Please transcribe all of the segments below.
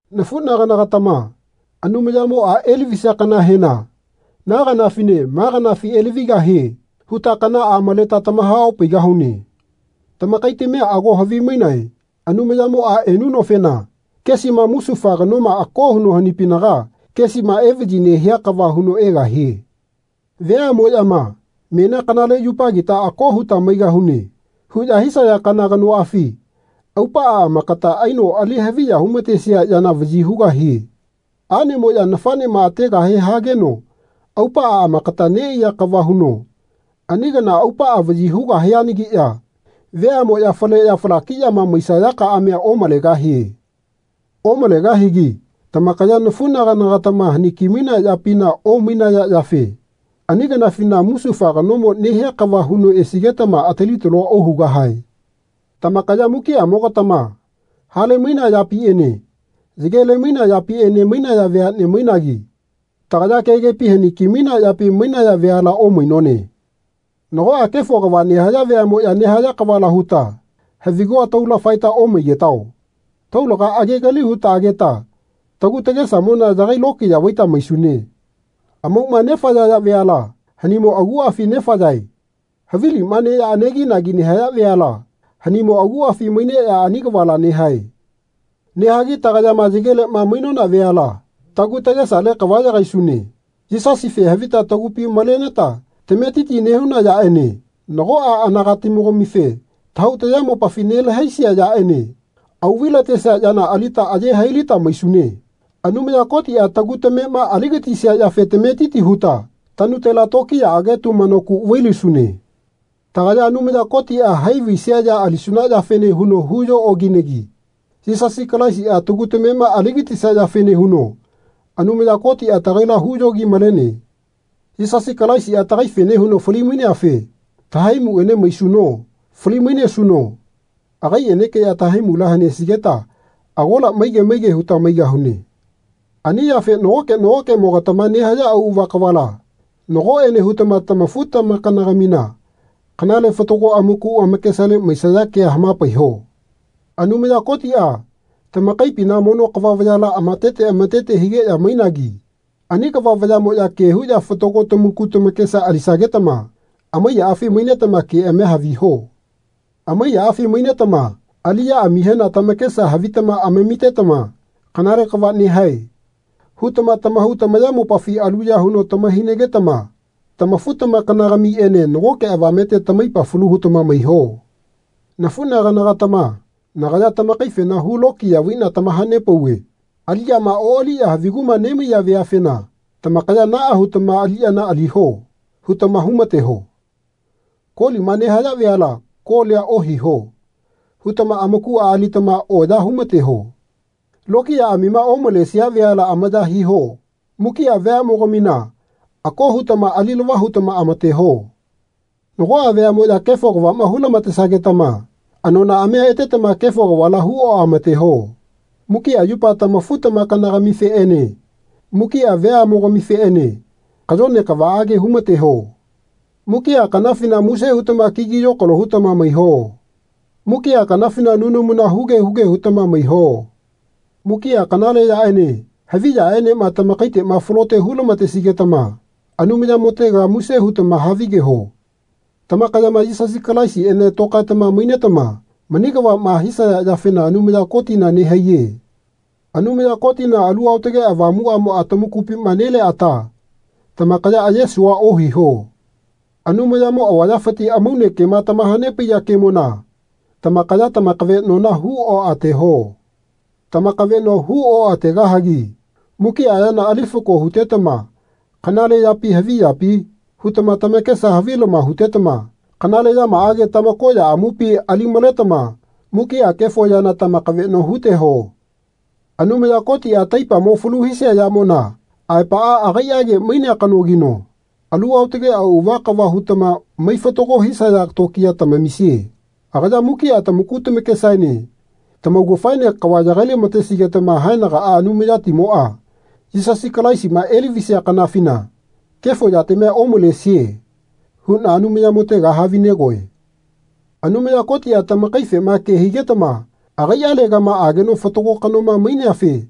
Nafunagana-gatama Anumayamoa elavisia kanahena Na kanafine ma kanafi elavigahie. huta kanaa maleta tamaha-opaigahune. Tamakaitamia ago havimainae Anumayamoa enunofena kesima musufa kanoma ako huno hanipinaga kesima evayi nehia kava huno egahie. Veamoyama Menia kanale yupagita ako huta maigahune. huya hisaya kana kanoafi aupaa amakata aino ali haviya humatesia yana vayi hugahie. Anemoya nafanema ategahe hageno aupaa amakata neaiya kava huno ani kana aupaa vayi hugahianagiya veamoya faleya falakiyama maisaya kaamia omalegahie. Omalegahigi tamakaya nafunagana-gatama haniki-mainea yapina omainaya yafe ani kanafina musufa kanomo nehia kava huno esigetama atili-talua ohugahae. Tamakaya mukiamogatama hale mainea yapiene yagele mainea yapiene mainaya veane mainagi tagaya kegepi haniki-mainea yapi mainaya veala omainone. Nagoa kefo kava nehaya veamoya nehaya kavala huta havigua taula faeta omaigetao. Taulaga agegali huta ageta tagu tagesamona yagai lokiya vaita maisune. Amauma nefayaya veala hanimo aguafi nefayae. Havilima neya aneginagi nehisaya veala hanimo aguafi maineya ani kavala nehae. Nehagi tagayama yagelema mainona veala tagu tagesale kava yagaisune. Yisasife havita tagupi maleneta tametiti nehuna yaene nagoa anagatimogamife tahau tayamopafi nelahaisia yaene auvai-latesia yana alita aye hailita maisune. Anumaya Kotia tagu tamema aligatisia yafe tametiti huta tanutela tokiyaage tumano ku vailisune. Tagaya Anumaya Kotia hai vaisia ya alisuna yafene huno huyo okinegi Yisasi Kalaisia tagu tamema aligatisia yafene huno Anumaya Kotia tagaila huyogi-malene. Yisasi Kalaisia tagaifene huno fali-maineafe tahaimuene mainesuno fali-mainesuno agaienekeya tahaimula hanesigeta agola maige maige huta maigahune. Ani yafe nagoke nagokemogatama nehaya auava kavala nagoene hutama tamafu-tamakana-gamina kanale fatago amaku amakesale maisaya kea hamapaiho. Anumaya Kotia tamakaipina mono kava vayala amatete amatete higeya mainagi ani kava vayamoya ke huya fatago tamaku tamakesa alisagetama amaiyaafi mainetama keamia haviho. Amaiyaafi mainetama aliyaamihena tamakesa havitama amamitetama Kanale kava nehae. hutama tamahau tamayamopafi aluya huno tama-hainagetama tamafu-tamakana-gamiene nagoke avamete tamaipa falu hutama maiho. Nafunagana-gatama nagaya tamakaifena hu lokiya vaina tamahapauve aliyama oaliya haviguma nemaiya veafena tamakaya Naa hutama aliyana aliho. hutama humateho. Kolima nehaya veala Kolia ohiho. hutama amakua alitama oya humateho. Lokiyaamima omalesia veala amaya hiho. Mukia veamogamina ako hutama alilava hutama amateho. Nagoa veamoya kefo kavama hulamatesagetama anonaamia etetama kefo kavala hu oamateho. Mukia yupa tamafu-tamakana-gamifeene mukia veamogamifeene kayone kavaage humateho. Mukia kanafina muse hutama kigi yokalo hutama maiho. Mukia kanafina nunamuna huge huge hutama maiho. Mukia kanale yaene havi yaenema tamakaitema falote hulamatesigetama Anumayamotega muse hutama havigeho. Tamakayama Yisasi Kalaisiene tokaetama mainetama mani kavama hisaya yafena Anumaya Kotina nehaiye. Anumaya Kotina Alu Aotage Avamuamoa tamakupima nelea ata tamakaya ayesua ohiho. Anumayamo avayafiti amaune kema tamahanepaiya kemona tamakaya tamakavenona hu oateho. Tamakaveno hu oategahagi mukia yana ali fako hutetama Kanale yapi havi yapi? hutama tamakesa havilama hutetama kanale yamaage tamakoya amupi ali-maletama mukia kefo yana tamakaveno huteho. Anumaya Kotia taipamo falu hisia yamona aepaa agaiage mainea kanogino alu aotage auava kava hutama mai fatago hisaya tokiya tamamisie. Agaya mukia tamaku tamakesaene tamaugafaene kava yagai-lamatesigetama haenagaa Anumayatimoa Yisasi Kalaisima elavisia kanafina kefo yatamia omalesie huna Anumayamotega havinegoe. Anumaya Kotia tamakaifema ke higetama agaialegama ageno fatago kanoma maineafe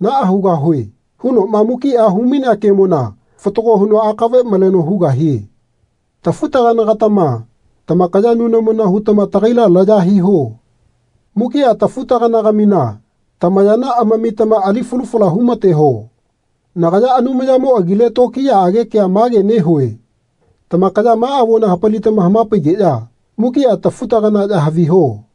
Naa hugahue. hunoma mukia humainea keamona fatago huno akave maleno hugahie. Tafu-tagana-gatama tamakaya nunamuna hutama tagaila laya hiho. Mukia tafutagana-gamina tamayana amamitama ali falu fala humateho. Nagaya Anumayamo agile tokiyaage kea mage nehue Tamakaya ma avona hapalitama hamapaigeya mukia tafu-taganaya haviho.